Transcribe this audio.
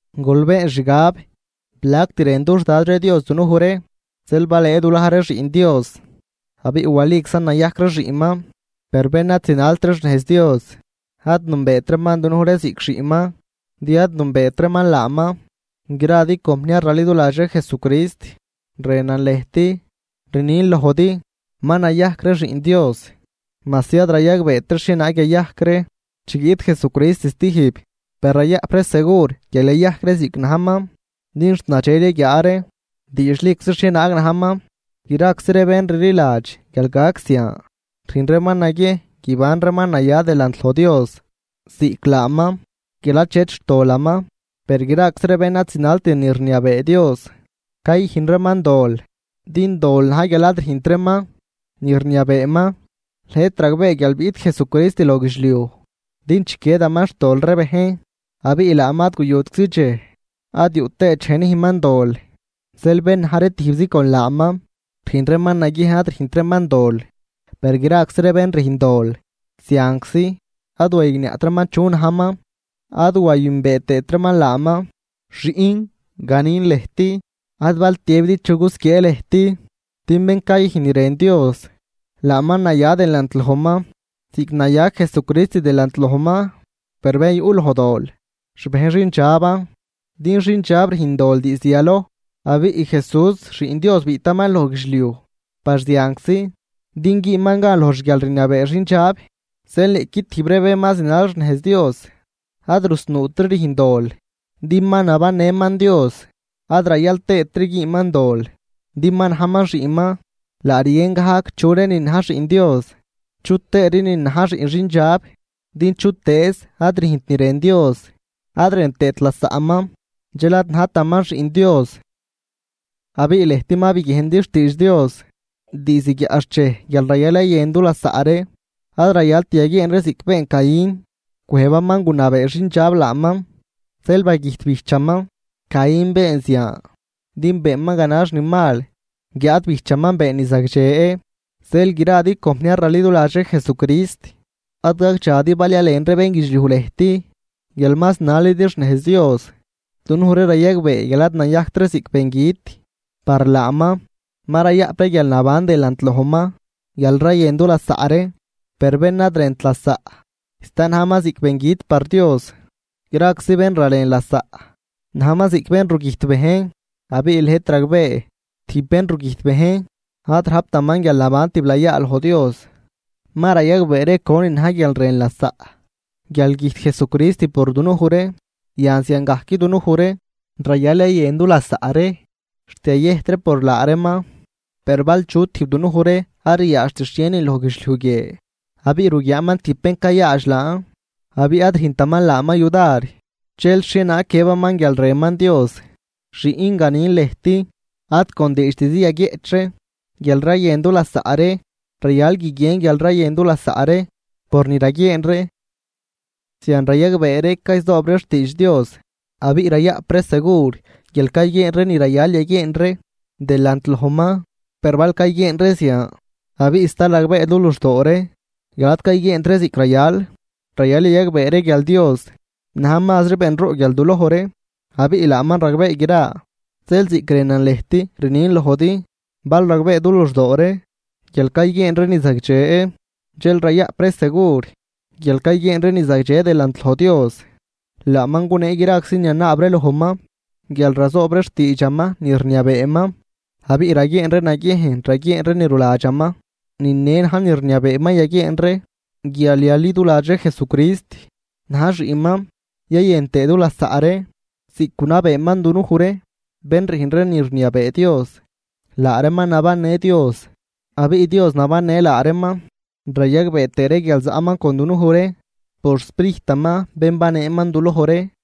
Gol been xgab, plact rën dux Dad ree Dios dunuj ree, zeel balëë dulaj ree xiꞌn Dios, abiꞌ waliczan nayajc ree xiꞌnman. Per bén ad zinalt ree xnejz Dios ad nünbeet reeman dunuj ree ziꞌc xiꞌnman, din ad nünbeet reeman laaman. Gradi compniar raliduladx ree Jesucrist, rënan lëjt, rnin lojdi: Ma nayajc ree xiꞌn Dios, majsi ad rayagbeet ree xhienaag yayajc ree chi guiꞌt Jesucrist stijb, per rayaꞌp ree segur guial yayajc ree ziꞌc najman, din xt nadxel yaguiaa ree diidxliczi xhienaag najman. Graczi ree bén rliladx guial gac zian, rüjn reeman naguiejn guiban reeman naya delant loj Dios ziꞌc laaman, guial achet xtolaman. Per graczi ree bén ad zinalt ni rniabee Dios, cayüjn reeman dol, din dol na̱j guial ad rüjnt reeman ni rniabeeman. Lëjt ragbee guial biꞌt Jesucrist loj guidxliuj din chiquiedaman xtol ree bejn, abiꞌ laaman ad guyutczi dxej ad yuꞌ tëët dxej nüjnman dol. Zeel bén na̱j ree tijbzi con laaman rüjn reeman naguiejn ad rüjnt reeman dol, per graczi bén rüjn dol zianczi ad wayigniaꞌt reeman chu najman, ad wayünbee tëët reeman laaman. Xiꞌn, ganin lëjt, ad bal tiëbidi chu gusquiee lëjt, din bén cayüjn ni rën Dios, laaman naya delant lojman ziꞌc naya Jesucrist delant lojman. Per bén yuꞌ loj dol xbejn xindxaban, din xindxab rüjn dol diizd yaloj, abiꞌ Jesús Xiꞌn Dios biꞌtaman loj guidxliuj par zianczi din güünman gan loj xguialrniabee xindxab. Zeel niꞌqui tijb ree bén ma zinal xnejz Dios ad rusnuutri rüjn dol, din ma nabannëman Dios, ad rayal tëëtri güünman dol din ma najman xiꞌnman. Laa rguien gajc chu reenin na̱j xiꞌn Dios chutëë reenin na̱j xiꞌn xindxab, din chutëëz ad rüjnt ni rën Dios ad rën tëët lasaꞌman, dxel ad najtaman xiꞌn Dios. Abiꞌ lëjt ma biguiejndi xtiidx Dios diizd guiaꞌxchej guial rayal yayën dulasaꞌ ree. Ad rayalt yaguieen ree ziꞌc been Caín, cwëjbaman gunabee xindxab laaman, zeel bagüjt bijchaman. Caín been zian, din beenman ganax ni mal, guiáad bijchaman been ni zagdxe. Zeel gradi compniar raliduladx ree Jesucrist, ad gagdxadi bal yalen ree bénguidxliuj lëjt guial ma zinalidi xnejz Dios. Dunuj ree rayagbee guial ad nayajct ree ziꞌc bengüt par laaman, ma rayaꞌp ree guialnaban delant lojman, guial rayën du lasaꞌ ree. Per bén ad rënt lasaꞌ, sta najman ziꞌc bengüt par Dios. Graczi bén ralen lasaꞌ najman ziꞌc bén rugüjt bejn, abiꞌ lëjt ragbee, tijb bén rugüjt bejn ad rajptaman guialnaban tiblayaa delant loj Dios. Ma rayagbee ree conin na̱j guial rën lasaꞌ, guial güjt Jesucrist por dunuj ree, yan ziangajc dunuj ree rayal yayën dulasaꞌ ree xt yayëjt ree por laa reeman. Per bal chu tijb dunuj ree ad riaadxt xhienin loj guidxliuj guie abiꞌ ruguiaaman tijb bén cayaadx laan abiꞌ ad rüjntaman laaman yudar, dxel, ¿xhienaag guiëbaman guial rënman Dios? Xiꞌn, ganin lëjt, ad con diidxtizi yaguieꞌch ree guial rayën dulasaꞌ ree, rayal guiguien guial rayën dulasaꞌ ree por ni raguieen ree. Zian rayagbee ree cayzoob ree xtiidx Dios, abiꞌ rayaꞌp ree segur guial cayguieen ree ni rayal yaguieen ree delant lojman. Per bal cayguieen ree zian abiꞌ sta ragbee du luxdoo ree guial ad cayguieent ree ziꞌc rayal, rayal yayagbee ree guial Dios na̱j mazri benroꞌ guial duloj ree, abiꞌ laaman ragbee gra. Zeel ziꞌc rënan lëjt rnin lojdi, bal ragbee du luxdoo ree guial cayguieen ree ni zagdxe, dxel rayaꞌp ree segur guial cayguieen ree ni zagdxe delant loj Dios. Laaman gunee graczi ni yanaab ree lojman guial razoob ree xtiidxaman ni rniabeeman, abiꞌ raguieen ree naguiejn raguieen ree ni ruladxaman. Ni ne na̱j ni rniabeeman yaguieen ree guial yaliduladx ree Jesucrist na̱j xiꞌnman yayën tëë dulasaꞌ ree ziꞌc gunabeeman dunuj ree. Bén rüjn ree ni rniabee Dios, laa reeman nabannë Dios abiꞌ Dios nabannë laa reeman, rayagbee tëë ree guial zaꞌman con dunuj ree por xSprijtaman bén baneeman duloj ree.